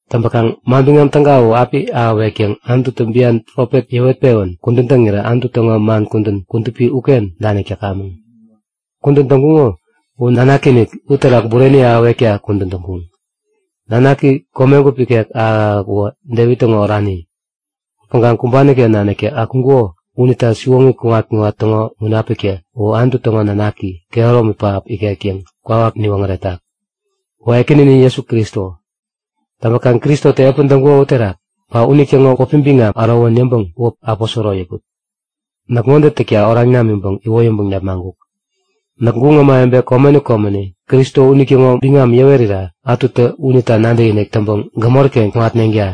Täŋpäkaŋ Manbiŋam Täga u api ahäwek yäŋ Anututä bian profet yäwet-pewän kudän täŋirä Anutu täŋo man kudän kudupi uken danik täkamäŋ. Kudän täŋkuŋo u Nanaki-inik uterak bureni ahäwekta kudän täŋkuŋ. Nanaki komegup ikek ahäk-ahäk uwä Devit täŋo orani. Upäŋkaŋ kumbani-ken naniktä akuŋkuko unita siwoŋi kuŋat-kuŋat täŋo Munapiktä U Anutu täŋo Nanaki, kehäromi pähap ikek yäŋ kwawak niwoŋäretak. Uwä Ekäninin Jesu Kristo. Täŋpäkaŋ Kristotä epän täŋkuko uterak, ba unitäŋo wäpi biŋam ärowän yäŋpäŋ wäp aposoro yäput. Näk ŋode täkta oraŋ namiŋpäŋ iwoyäŋpäŋ nepmaŋkuk; Näk guŋ ämawebe komeni komeni Kristo unitäŋo biŋam yäwerira ätutä unita nadäkinik täŋpäŋ gämori-ken kuŋatneŋta.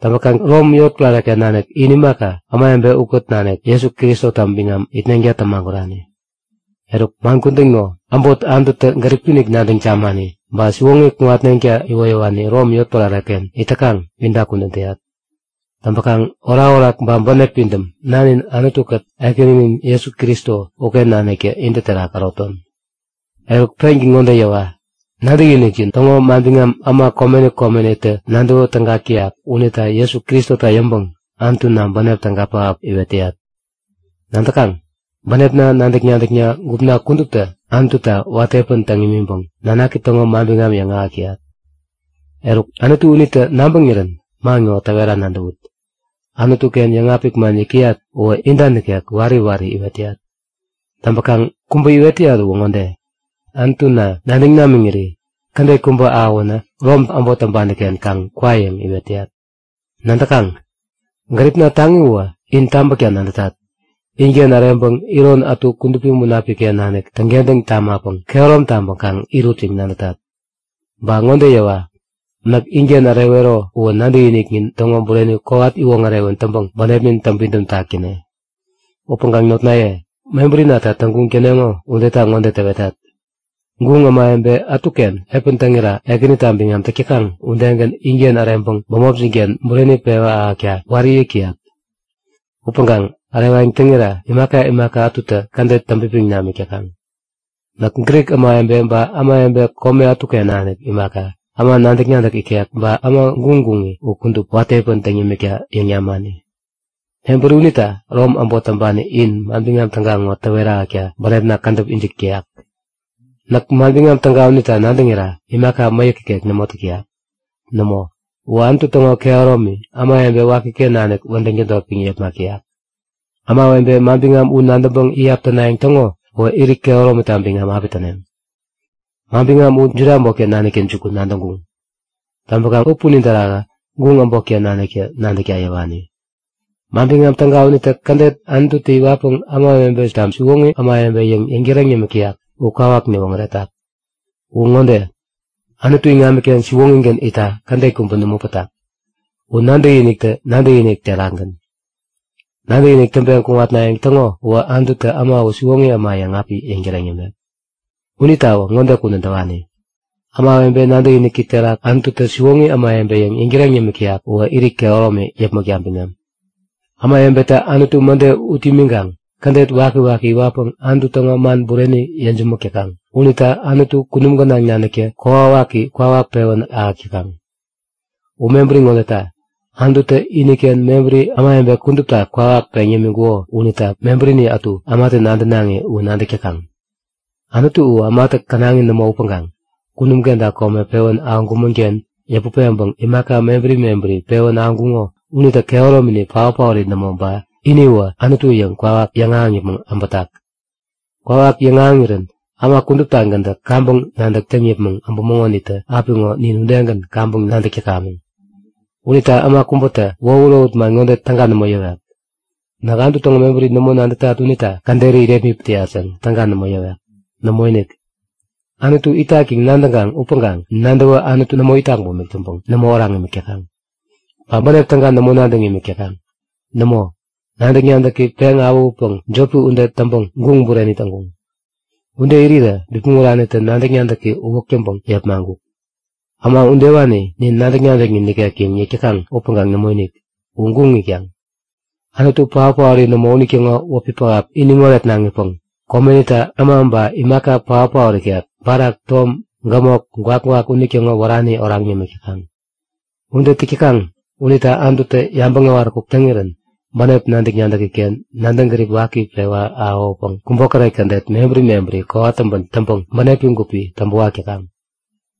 Täŋpäkaŋ Rom yotpärare-ken nanik in imaka, ämawebe ukät nanik, Jesu Kristota biŋam itneŋta tämagurani. Eruk, man kudän ŋo, äbot Anututä gäripi-inik nadäŋ tamani, ba siwoŋi kuŋatneŋta iwoyäwani Rom yotpärare-ken it täkaŋ inta kudän täyat. Täŋpäkaŋ orakorak ba bänep pidäm Nanin Anutu-kät Ekäninin Jesu Kristo uken naniktä intä terak äroton. Eruk, pengän ŋode yäwa; Nadäkinikjin täŋo manbiŋam äma komeni komenitä nadäwä täga täk täyak unita Jesu Kristota yäŋpäŋ Anutuna bänep täga pähap iwet täyat. Nadäkaŋ? Bänepna nadäk-nadäkna gupna kuduptä Anututa watä epän täŋ imiŋpäŋ Nanaki täŋo manbiŋam yäŋahäk täyat. Eruk, Anutu unitä nabäŋirän man ŋo täwera nadäwut; Anutu-ken yäŋapik man yäk täyat uwä inta nikek wari wari iwet täyat. Täŋpäkaŋ kubä iwet täyat uwä ŋode; Anutuna nadäŋ namiŋiri kädet kubä ahäwänä Rom äbot täŋpani-ken kaŋ kwa yäŋ iwet täyat. Nadäkaŋ? Gäripna taŋi uwä in tabäkta nadätat. Inken äreŋpäŋ iron ätu Kudupi Munapik-ken nanik täŋkentäŋ tamapäŋ kehärom taŋpäŋ kaŋ irut yäŋ nadätat. Ba ŋode yäwa, näk inken ärewero uwä nadäkiniknin täŋo bureni kowat iwoŋärewän täŋpäŋ bänepnin täŋpidäm tak täne. Upäŋkaŋ notnaye, mebärinata täŋguŋ täneŋo udeta ŋode täwetat; Guŋ ämawebe ätuken epän täŋira Ekänita biŋam täk täkaŋ udegän inken äreŋpäŋ bämopjin-ken bureni pewa ahäkta wari yäk täyat. Upäŋkaŋ ärewayäŋ täŋira imaka imaka ätutä kädet täŋpipiŋ namik täkaŋ. Näk Grik ämawebe ba ämawebe kome ätuken nanik imaka, äma nadäk-nadäk ikek ba äma guŋguŋi u kudup, watä epän täŋ yämikta yäŋ namani. Mebäri unita Rom äbot täŋpani in Manbiŋam Täga ŋo täwet ahäkta bänepna kädäp ijik täyak. Näk Manbiŋam Täga unita nadäŋira imaka mäyäki nikek nämo täk täyak. Nämo, uwä Anutu täŋo kehäromi ämawebe wakiken nanik wädäŋ tädotpäŋ yepmak täyak. Ämawebe manbiŋam u nadäŋpäŋ iyap tänayäŋ täŋo uwä irit kehäromita biŋam api täneŋ. Manbiŋam u Juda äbotken naniktä jukun nadäŋkuŋ. Täŋpäkaŋ u punin terakä guŋ äbotken naniktä nadäkta yäwani. Manbiŋam Täga unitä kädet Anututä iwatpäŋ ämawebeta siwoŋi ämawebe yäŋ yäŋtäreŋ yämik täyak u kwawak niwoŋäretak. Uwä ŋode; Anutu iŋamiken siwoŋigän itta kädet kubä nämo pätak. U nadäkiniktä nadäkinik terakgän. Nadäkinik täŋpeŋ kuŋatnayäŋ täŋo uwä Anututä äma u siwoŋi äma yäŋ api yäŋtäreŋ yämek. Unitawä ŋode kudän täwani; Ämawebe nadäkiniki terak Anututä siwoŋi ämawebe yäŋ yäŋtäreŋ yämik täyak uwä irit kehäromi yäpmäkta biŋam. Ämawebetä Anutu mäde ut imiŋkaŋ kädet wakiwaki iwatpäŋ Anutu täŋo man bureni yejämäk täkaŋ. Unita Anutu kunum gänaŋ naniktä kokwawaki kwawak pewän ahäk täkaŋ. U mebäri ŋodeta; Anututä iniken mebäri ämawebe kudupta kwawak peŋ yämiŋkuko unita mebärini ätu ämatä nadänaŋi u nadäk täkaŋ. Anutu u ämatä känaŋi nämo upäŋkaŋ kunum kenta kome pewän ahäŋkumän-ken yäput peŋpäŋ imaka mebäri mebäri pewän ahäŋkuŋo unitä kehäromini paot-paori nämo ba iniwä Anutu yäŋ kwawak yäŋahäŋ yäpmäŋ äbätak. Kwawak yäŋahäŋirän äma kuduptagäntä kaŋpäŋ nadäk täŋ yäpmäŋ äbuŋonitä apiŋo nin udegän kaŋpäŋ nadäk täkamäŋ. Unita äma kubätä wohut-wohut man ŋode täga nämo yäwek; Näk Anutu täŋo mebäri nämo nadätat unita käderi irepmit täyat yäŋ täga nämo yäwek. Nämoinik! Anutu itak yäŋ nadäŋkaŋ upäŋkaŋ nadäwä Anutu nämo itak bumik täŋpäpäŋ, nämo oraŋ imik täkaŋ, ba bänep täga nämo nadäŋ imik täkaŋ. Nämo, nadäk-nadäki peŋ awähutpäŋ jopi ude täŋpäŋ guŋ bureni täŋkuŋ. Ude irirä bipmäŋ uranitä nadäk-nadäki uwäk täŋpäŋ yepmaŋkuk. Äma udewani Nin nadäk-nadäknin nikek yäŋ yäk täkaŋ upäŋkaŋ nämoinik! U guŋ itkaŋ. Anutu paot-paori nämo unitäŋo wäpi pähap iniŋ oretnaŋipäŋ komenita äma ba imaka paotpaot ikek, barak, tom, gämok, gwakgwak unitäŋo wärani oraŋ yämik täkaŋ. Ude täk täkaŋ unita Anututä yabäŋ äwaräkuk täŋirän bänep nadäk-nadäki-ken nadäŋ gärip waki pewä ahäwäpäŋ kubokäret kädet mebäri mebäri kowat täŋpän täŋpäŋ bänepi gupi täŋpäwak täkaŋ.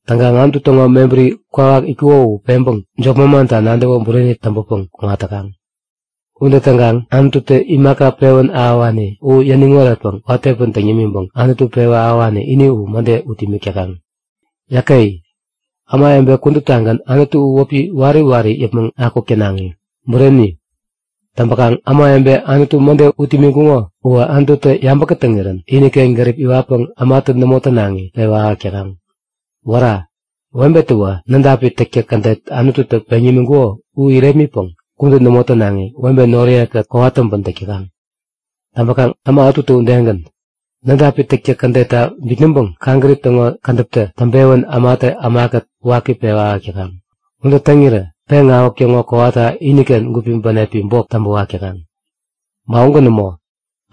Täŋkaŋ Anutu täŋo mebäri kwawak itkuko u peŋpäŋ jop manmanta nadäwä bureni täŋpäpäŋ kuŋat täkaŋ. Ude täŋkaŋ Anututä imaka pewän ahäwani u yäniŋ oretpäŋ watä epän täŋ yämiŋpäŋ Anutu pewä ahäwani ini u mäde ut imik täkaŋ. Yäke! Ämawebe kuduptagän Anutu u wäpi wari wari yäpmäŋ akuk tänaŋi! Bureni! Täŋpäkaŋ ämawebe Anutu mäde ut imiŋkuŋo uwä Anututä yabä kätäŋirän iniken gärip iwatpäŋ ämatä nämo tänaŋi pewä ahäk täkaŋ. Wära! Webetäwä nädapi täktäk kädet Anututä peŋ yämiŋkuko u irepmitpäŋ kudän nämo tänaŋi webe noriye-kät kowat täŋpän täk täkaŋ. Täŋpäkaŋ äma ätutä udegän, nädapi täktäk kädetta bitnäŋpäŋ kaŋgärip täŋo kädäpitä täŋpewän ämatä ämakät waki pewä ahäk täkaŋ. Ude täŋirä peŋawäk täŋo kowata iniken gupi bänepi bok täŋpäwak täkaŋ. Ba ugän nämo.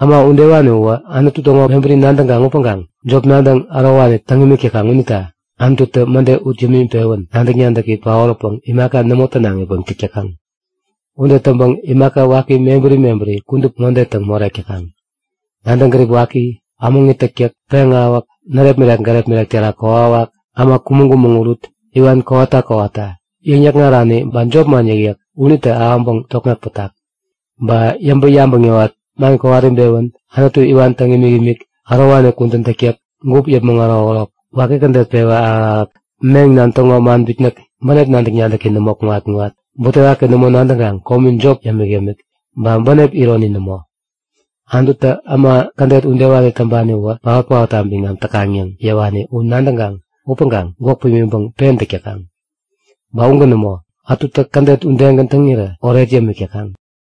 Äma udewani uwä Anutu täŋo mebäri nadäŋkaŋ upäŋkaŋ jop nadäŋ ärowani täŋ imik täkaŋ unita Anututä mäde ut yämiŋpewän nadäk-nadäki paoräpäŋ imaka nämo tänaŋipäŋ täk täkaŋ. Ude täŋpäŋ imaka waki mebäri mebäri kudup ŋode täŋ morek täkaŋ; Nadäŋ-gärip waki, ämäŋi täktäk, peŋawäk, närepmirek-gärepmirek terak kokwawak, äma kumäŋ-kumäŋ urut, iwan kowata kowata, yäŋ-yäkŋarani ba jopman yäkyäk unitä ahäŋpäŋ tokŋeŋ pätak. Ba yäŋpäŋ-yabäŋ yäwat, man kowat-ibewän, Anutu iwan täŋ imikimik, ärowani kudän täktäk, gup yäpmäŋ ärokärok, waki kädet pewä ahäk-ahäk, meŋnan täŋo man bitnäk, bänep nadäk-nadäki nämo kuŋat-kuŋat, butewaki nämo nadäŋkaŋ komi jop yämik-yämik, ba bänep ironi nämo. Anututä äma kädet udewani täŋpani uwä paot-paotta biŋam täkaŋ yäŋ yäwani u nadäŋkaŋ upäŋkaŋ gwäk pimiŋpäŋ pen täk täkaŋ. Ba ugän nämo, ätutä kädet udegän täŋirä oret yämik täkaŋ.